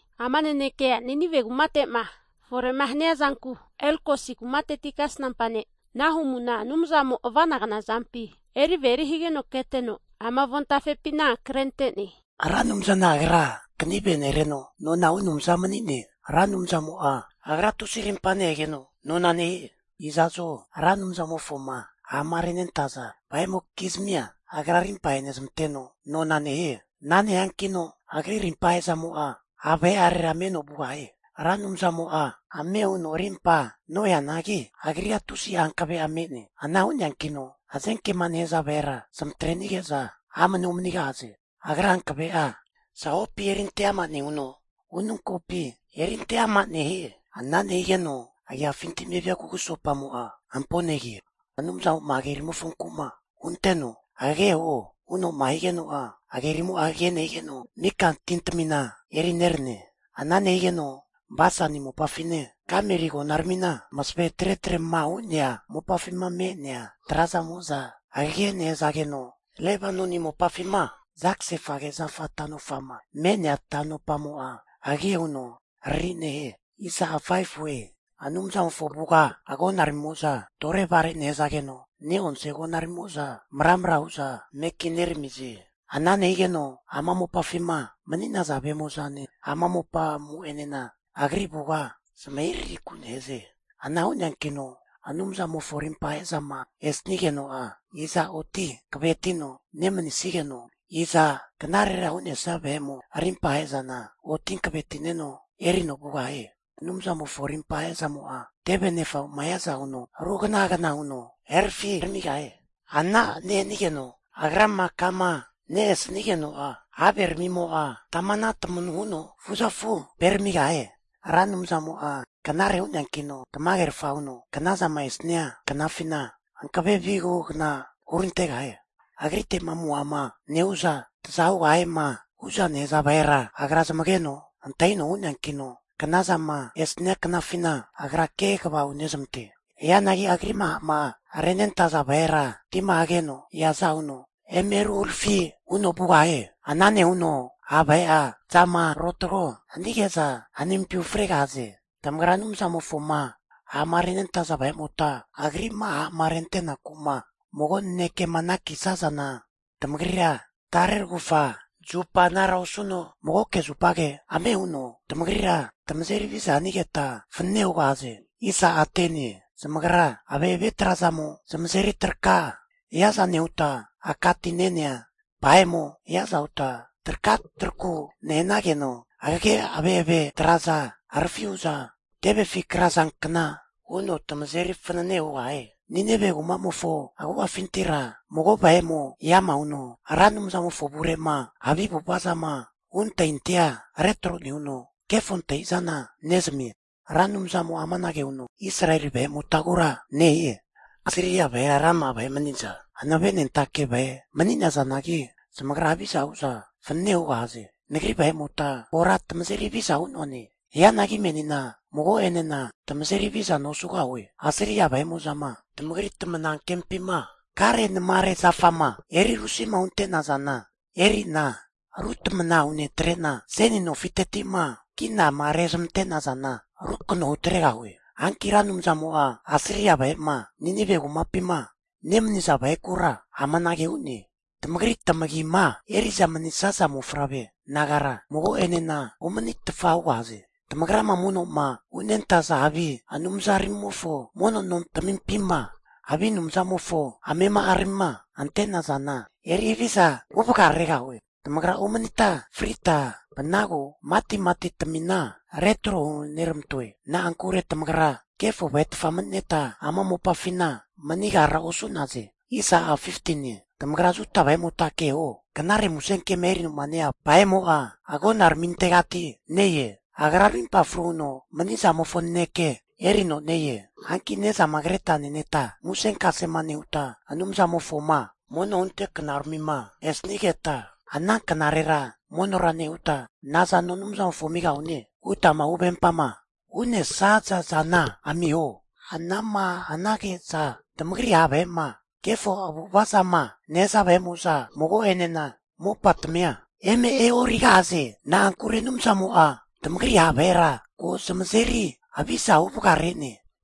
Ama nanekea Ninive kumate'ma fore hania zanku Elkosi kumateti kasnampa ne' Nahumuna Anumzamo ava'nagna zampi eri averi humigeno keteno, ama avontafepina krente'ne. Ra Anumzana agra kanive nereno nona hu Anumza mani'ne. Ra Anumzamo'a Agra tusi arimpa nehegeno nona nehie. Iza'zo Ra Anumzamofoma ha'ma renentaza vahe'mokizmia Agra arimpa ahenezmanteno nona nehie. Ana nehiankino Agri rimpa ahe'zamo'a ha' vahe'arera meno vugahie. Ra Anumzamo'a ame huno arimpa noheanagi, Agrira tusi'a hankave'a me'ne. Ana hu'neankino hazenkema nehaza vahera zamatrenige'za amanea omanigahaze. Agra hankave'a zahopi erinte ama nehuno, ununkopi erinte ama nehie. Ana nehigeno agiafinti'ma evia kugusopamo'a hampona negie. Anumzamo'a hagerimofonku hunteno, hagege huo huno'ma higeno'a, hagerimo'a hagege nehanageno, mika tintamina eri nerane. Ana nehigeno Basani mopafine, Kameli agonaramima masave tretre'ma hu'nea mopafima me'nea traza'mo'za hagege nehanageno, Lebanoni mopafima zagasefage zafa tanopama me'nea tanopamo'a hagege huno harari nehie. Anumzamofo avuga agonaramimo'za torevare nehazageno, ne'onse agonaramimo'za mara'mra hu'za mekineramize. Ana nehigeno ama mopafima mani'naza vahe'mo'zane, ama mopamo'enena Agri avuga zamahirahiku nehaze. Ana hu'neankino Anumzamofo arimpahe zama esanigeno'a, iza oti hankavetino nemanisigeno, iza knarera hu'nesia vahemo rimpa ahe'zana oti hankavetineno erino vugahie? Anumzamofo arimpa ahe'zamo'a teve nefamo'ma hiaza huno ruhagana hagana huno herafiramigahie. Ana nehanigeno Agrama kama ne-e sanigeno'a haveramimo'a tamana tamanu huno fuzafuperamigahie. Ra Anumzamo'a knare hu'neankino, tamagerfa huno knazama esania knafina hankave vihugna hurantegahie. Agrite'ma amuhama nehu'za taza hugahiema hu'za nehaza vahera Agra zamageno antahino hu'neankino, knazama esania knafina Agra kegava hunezamante. Hianagi Agri'ma ha'ma renentaza vahera, tima hageno eaza huno eme ruharafi huno vugahie. Ana nehuno ha' vahe'a zamarotago hanige'za hanimpi ufregahaze. Tamagra Anumzamofoma ha'ma renentaza vahe'mota, Agri'ma ha'ma rentenaku'ma mago nanekema anakisazana, tamagrira tare ragufa zupa anara osuno, magoke zupage ame huno tamagrira tamazeri haviza hanigeta fanane hugahaze. Zamagra ave'ave trazamo zamazeri traka hiaza nehuta, aka ti ne'nea vahe'mo hiaza huta traka taraku nehanageno, hagege ave've traza harafi hu'za tevefi krazankna huno tamazeri fanane hugahie. Ninive kumamofo agu'afintira mago vahe eama huno, Ra Anumzamofo avure'ma havi avu'ava zama hu' antahintahia retro nehuno kefo antahi'zana nezamie. Ra Anumzamo'a amanage huno Israeli vahe'motagura nehie, Asiria vahera rama'a vahe maniza hankavenentake vahe mani'nazanagi zamagra haviza hu'za fanane hugahaze. Nagri vahe'mota kora tamazeri haviza hu'noane. Hianagi menina mago'enena tamazeri havizana osugahue. Asiria vahe'mo'zama tamagri tamanankempima karenamare zafama eri rusima hunte nazana eri'na ru tamana hunetre'na, seni nofiteti'ma kinama rezamante nazana rukano hutregahue. Hanki Ra Anumzamo'a Asiria vahe'ma Ninive kumapima nemaniza vahekura amanage hu'ne. Tamagri tamagima eri'za manisnaza mofavre nagara, mago'enena omanitfa hugahaze. Tamagrama mono'ma hunentaza havi anumzaramimofo mono nontamimpima havi anumzamofo amema'aramima ante'nazana eri haviza huvagaregahue. Tamagra omanita frita vanagu matimati tamina retro huneramantoe. Na'ankure tamagra kefo vahetfa mani'neta ama mopafina manigara osu'naze. Tamagra Juda vahe'mota keho, knare musenkema erinoma ne-ea vahe'mo'a agonaramintegati ne-e. Agra arimpa fru huno mani zamofo naneke erino ne-e. Hanki ne'zama kreta neneta musenkasema nehuta Anumzamofoma mono hunte knaramima esanigeta, ana knarera monora nehuta, nazano Anumzamofo amigahune hutama huvempama hu'nesaza zana amiho. Ana'ma hanage'za tamagri ha' vahe'ma kefo avu'ava zama nehaza vahe'mo'za mago'enena mopatamia eme e'origahaze. Na'ankure Anumzamo'a tamagri ha' vahera ko zamazeri haviza huvagare'ne.